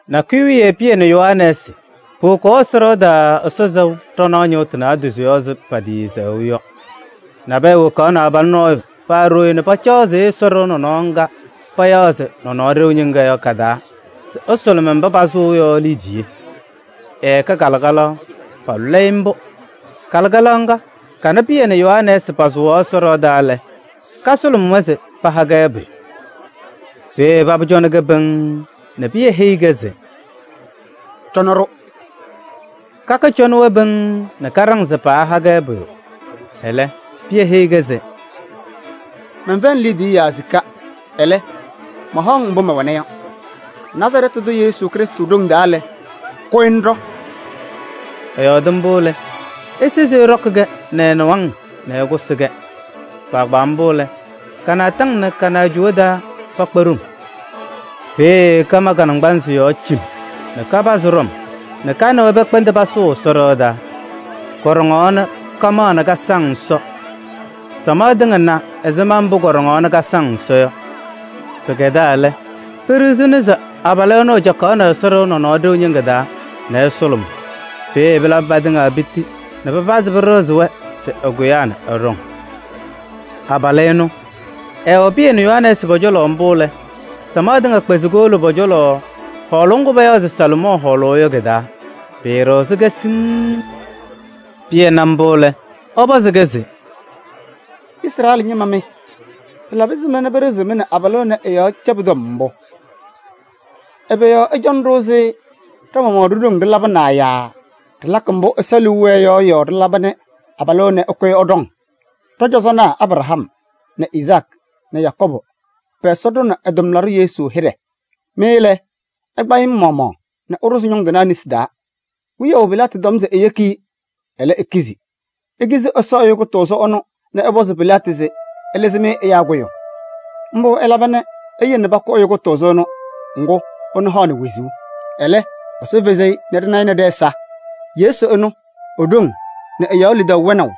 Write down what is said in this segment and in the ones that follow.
Nakʋyʋ wiye Pɩyɛ nɛ Yohanɛɛsɩ powokaɣ Ɛsɔ ɖɩɣa taa Ɛsɔ sɛʋ ɖanaɣ ñɩɣtʋ naadozo yɔɔ ɛzɩ patɩɩsɛɣʋ yɔ. Nabɛyɛ wokaɣnɩ abalʋ nɔɔyʋ paa ɖooye nɛ pacaɣzɩɣ Ɛsɔ ɖɩɣa nɔnɔɔ ŋga payaɣ se Nɔnɔɔ Ɖeu Ñɩŋga yɔ ka-taa se ɛsʋlʋmɩ mba pasʋʋ yɔ liidiye. Ɛkɛ kalɩkalaɣ, paalʋlɩ-ɩ mbʋ. Kalɩkalaɣ ŋga kana Pɩyɛ nɛ Yohanɛɛsɩ pasʋwaɣ Ɛsɔ ɖɩɣa taa lɛ, kasʋlʋmɩ-wɛ se paha-kɛ pʋyʋ. Peeye Paba cɔnɩ-kɛ pɩŋŋ nɛ Pɩyɛ heyi-kɛ se: “Cɔnɩ-ɖʋ.” Kaka ñɔcɔnɩ-wɛ pɩŋŋ nɛ kaɖaŋ se paaha-kɛ pʋyʋ. Ɛlɛ, Pɩyɛ heyi-kɛ se: “Mɛnfɛyɩnɩ liidiye yaa sika, ɛlɛ, mahaɣ-ŋ mbʋ mɛwɛna yɔ: Nazarɛɛtɩ tʋ Yesu Krɩstʋ ɖoŋ taa lɛ, kʋyɩ ŋɖɔ!” Ɛyɔɔdɩ mbʋ lɛ, esezi ɛɖɔkɩ-kɛ nɛ ɛ-nɩwaŋ nɛ ɛkʋsɩ-kɛ. Kpaagbaa mbʋ lɛ, ka-naataŋ nɛ ka-naajʋwa taa pakpa ɖoŋ. Peeye kama ka-naŋgbanzɩ yɔɔ cim nɛ kapazɩ ɖɔm nɛ ka nɛ wɛ pɛkpɛndɩ pasʋʋ Ɛsɔ ɖɩɣa taa. Kɔɖɔŋaɣ nɛ kamaɣ nɛ kasaŋ Ɛsɔ. Samaɣ tɩŋa na ɛzɩma mbʋ kɔɖɔŋaɣ nɛ kasaŋ Ɛsɔ yɔ. Pɩkɛdaa lɛ, peɖiɣzini se abalʋ ɛnʋ ɛcakaɣnɩ Ɛsɔ ɖɩɣa Nɔnɔɔ Ɖeu Ñɩŋga taa nɛ ɛsʋlʋmʋʋ. Peeye pɩlabɩ patɩŋa piti nɛ pɩpazɩ pɩɖɩɣzɩ-wɛ se ɛkʋyaa nɛ ɛɖɔŋ. Abalʋ ɛnʋ, ɛwɛ Pɩyɛ nɛ Yohanɛɛsɩ pɔ-cɔlɔ mbʋ lɛ, samaɣ tɩŋa kpɛzɩ kowolo pɔ-cɔlɔ hɔɔlʋʋ ŋgʋ payaɣ se Salomɔɔ Hɔɔlʋʋ yɔ kɩ-taa, pɩɩɖɩɣzɩ-kɛ siŋŋ. Pɩyɛ na mbʋ lɛ, ɛpɔzɩ-kɛ se: “Izrɛɛlɩ ñɩma mɩ! Pɩlabɩ ɛzɩma pɩɖɩɣzɩɣ-mɩ nɛ abalʋ ɛnɛ ɛ-yɔɔ cɛbʋ tɔm mbʋ? Ɛbɛ yɔɔ ɩcɔnɩ-ɖʋ ɛzɩ ɖa-maɣmaɣ ɖo-ɖoŋ ɖɩlabɩnaa yaa ɖɩlakɩ mbʋ Ɛsɔ liu wɛɛ yɔ yɔɔ ɖɩlaba nɛ abalʋ ɛnɛ ɛkʋyɩ ɛɖɔŋ? Ɖɔ-cɔzɔnaa Abraham nɛ Izaakɩ nɛ Yakɔɔbʋ pɛ-Ɛsɔ ɖʋnɩ ɛ-tʋmlaɖʋ Yesu hɩɖɛ. Mɩ lɛ, ɩkpa-ɩ mɩ-maɣmaɣ nɛ ɩɖʋzɩ ñʋŋ tɩnaa nesi taa. Wiyaʋ Pilaatɩ tɔm se eyeki-i, ɛlɛ, ikizi. Ikizi Ɛsɔ Ɛyʋ Kʋtʋʋzʋ ɛnʋ nɛ ɩpɔzɩ Pilaatɩ se ɛlɩzɩ-mɩ ɛyaa kʋyʋ. Mbʋ ɩlaba nɛ iyele pakʋ Ɛyʋ Kʋtʋʋzʋ ɛnʋ, ŋgʋ ɛnʋ haɣnɩ wezuu. Ɛlɛ, Ɛsɔ fezi-i nɛ ɖɩna-ɩ nɛ ɖɛ-ɛza. Yesu ɛnʋ, e-ɖoŋ nɛ ɛ-yɔɔ lidaʋ wɛnaʋ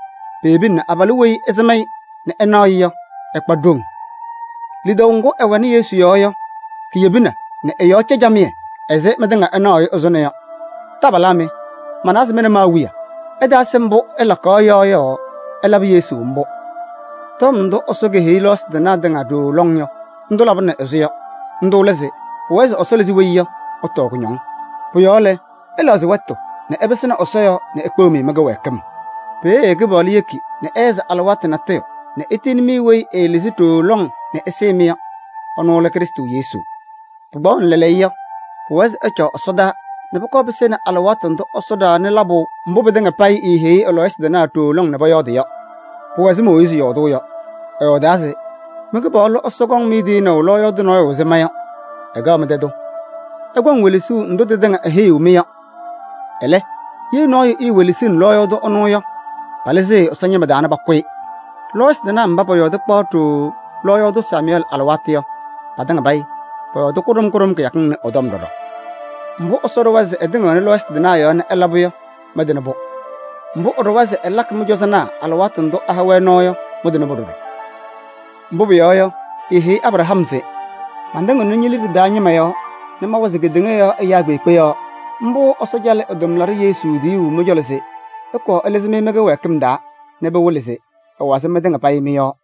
peyebina nɛ abalʋ weyi ɩsɩm-ɩ nɛ ɩnaɣ-ɩ yɔ, ɛkpa ɖoŋ. Lidaʋ ŋgʋ ɛwɛnɩ Yesu yɔɔ yɔ kiyebina nɛ ɛ-yɔɔ cɛ camɩyɛ ɛzɩ mɩtɩŋa ɩnaɣʋ-ɩ ɛzʋnɔ yɔ. Taabalaa mɩ! Manawa se mɩ nɛ mɩ-awiya ɩtaasɩ mbʋ ɩlakaɣ yɔ yɔɔ ɩlabɩ Yesu mbʋ. Tɔm ndʋ Ɛsɔ keheyi lɔɔyɩsɩ tɩnaa tɩŋa ɖooo lɔŋ yɔ, ndʋ labɩnɩ ɛzʋnɔ yɔ. Ndʋ lɛ se pʋwɛɛ se Weyi Ɛsɔ Lɩzaa Yɔ ɛtɔɔ kʋñɔŋ. Pʋ-yɔɔ lɛ, ɩlɛɣzɩ wɛtʋ nɛ ɩpɩsɩnɩ Ɛsɔ yɔɔ nɛ ekpeɣ-mɩ mɩ-kɩwɛɛkɩm. Peeye Kɩpaɣlʋ yeki nɛ ɩhɛzɩ alɩwaatʋ natʋyʋ nɛ etiyini-mɩ weyi ɛɛlɩzɩ ɖooo lɔŋ nɛ ɛsɩɩ-mɩ yɔ. Ɛnʋ lɛ Krɩstʋ Yesu. Pɩkpaɣʋnɩ lɛɛlɛɛyɔ yɔ, pʋwɛɛ se ɛcaɣ ɛsɔdaa nɛ pʋkɔɔ pɩsɩnɩ alɩwaatʋ ndʋ Ɛsɔ ɖaɣnɩ labʋ mbʋ pɩtɩŋa payɩ eeheyi ɛ-lɔɔyɩsɩ tɩnaa ɖooo lɔŋ nɛ pɔyɔɔdɩ yɔ. Pʋwɛ ɛzɩ Mooyiizi yɔɔdʋʋ yɔ. Ɛyɔɔdaa se: ‘Mɩ-Kɩpaɣlʋ Ɛsɔ kɔŋ-mɩ tiyinaʋ lɔɔyaɣ tʋ nɔɔyʋ ɛzɩ ma yɔ, ɛkɛɣ mɩ-tɛ tʋ. Ɩkɔŋ welesuu ndʋ tɩtɩŋa eheyiɣ-mɩ yɔ. Ɛlɛ, ye nɔɔyʋ etewelesini lɔɔyaɣ tʋ ɛnʋ yɔ, palɩzɩɣ-ɩ Ɛsɔ ñɩma taa nɛ pakʋ-ɩ.’ Lɔɔyɩsɩ tɩnaa mba pɔyɔɔdɩ kpaɣ ɖooo lɔɔyaɣ tʋ Samʋyɛɛlɩ alɩwaatʋ yɔ, patɩŋa payɩ pɔyɔɔdɩ kʋɖʋm kʋɖʋm kɩyakɩŋ ɩnʋ ɩ-tɔm ɖɔɖɔ. Mbʋ Ɛsɔ ɖʋwa se ɛtɩŋɩɣnɩ lɔɔyɩsɩ tɩnaa yɔɔ nɛ ɛla yɔ, mɩtɩnɩ-pʋ. Mbʋ ɛɖʋwa se ɛlakɩ mɩ-cɔzɔnaa alɩwaatʋ ndʋ ɛha-wɛ nɔɔ yɔ, mɩtɩnɩ-pʋ ɖɔɖɔ. Mbʋ pʋyɔɔ yɔ, eeheyi Abraham se: ‘Matɩŋɩɣnɩ ñe-liɖe taa ñɩma yɔɔ nɛ mawazɩ kedeŋa yɔɔ ɛyaa kpeekpe yɔɔ.’ Mbʋ Ɛsɔ calɩ ɛ-tʋmlaɖʋ Yesu tiyuu mɩ-cɔlɔ se ɛkɔɔ ɛlɩzɩ-mɩ mɩ-kɩwɛɛkɩm taa nɛ pɩwɩlɩ se ɛwazɩ mɩtɩŋa payɩ mɩ-yɔɔ.”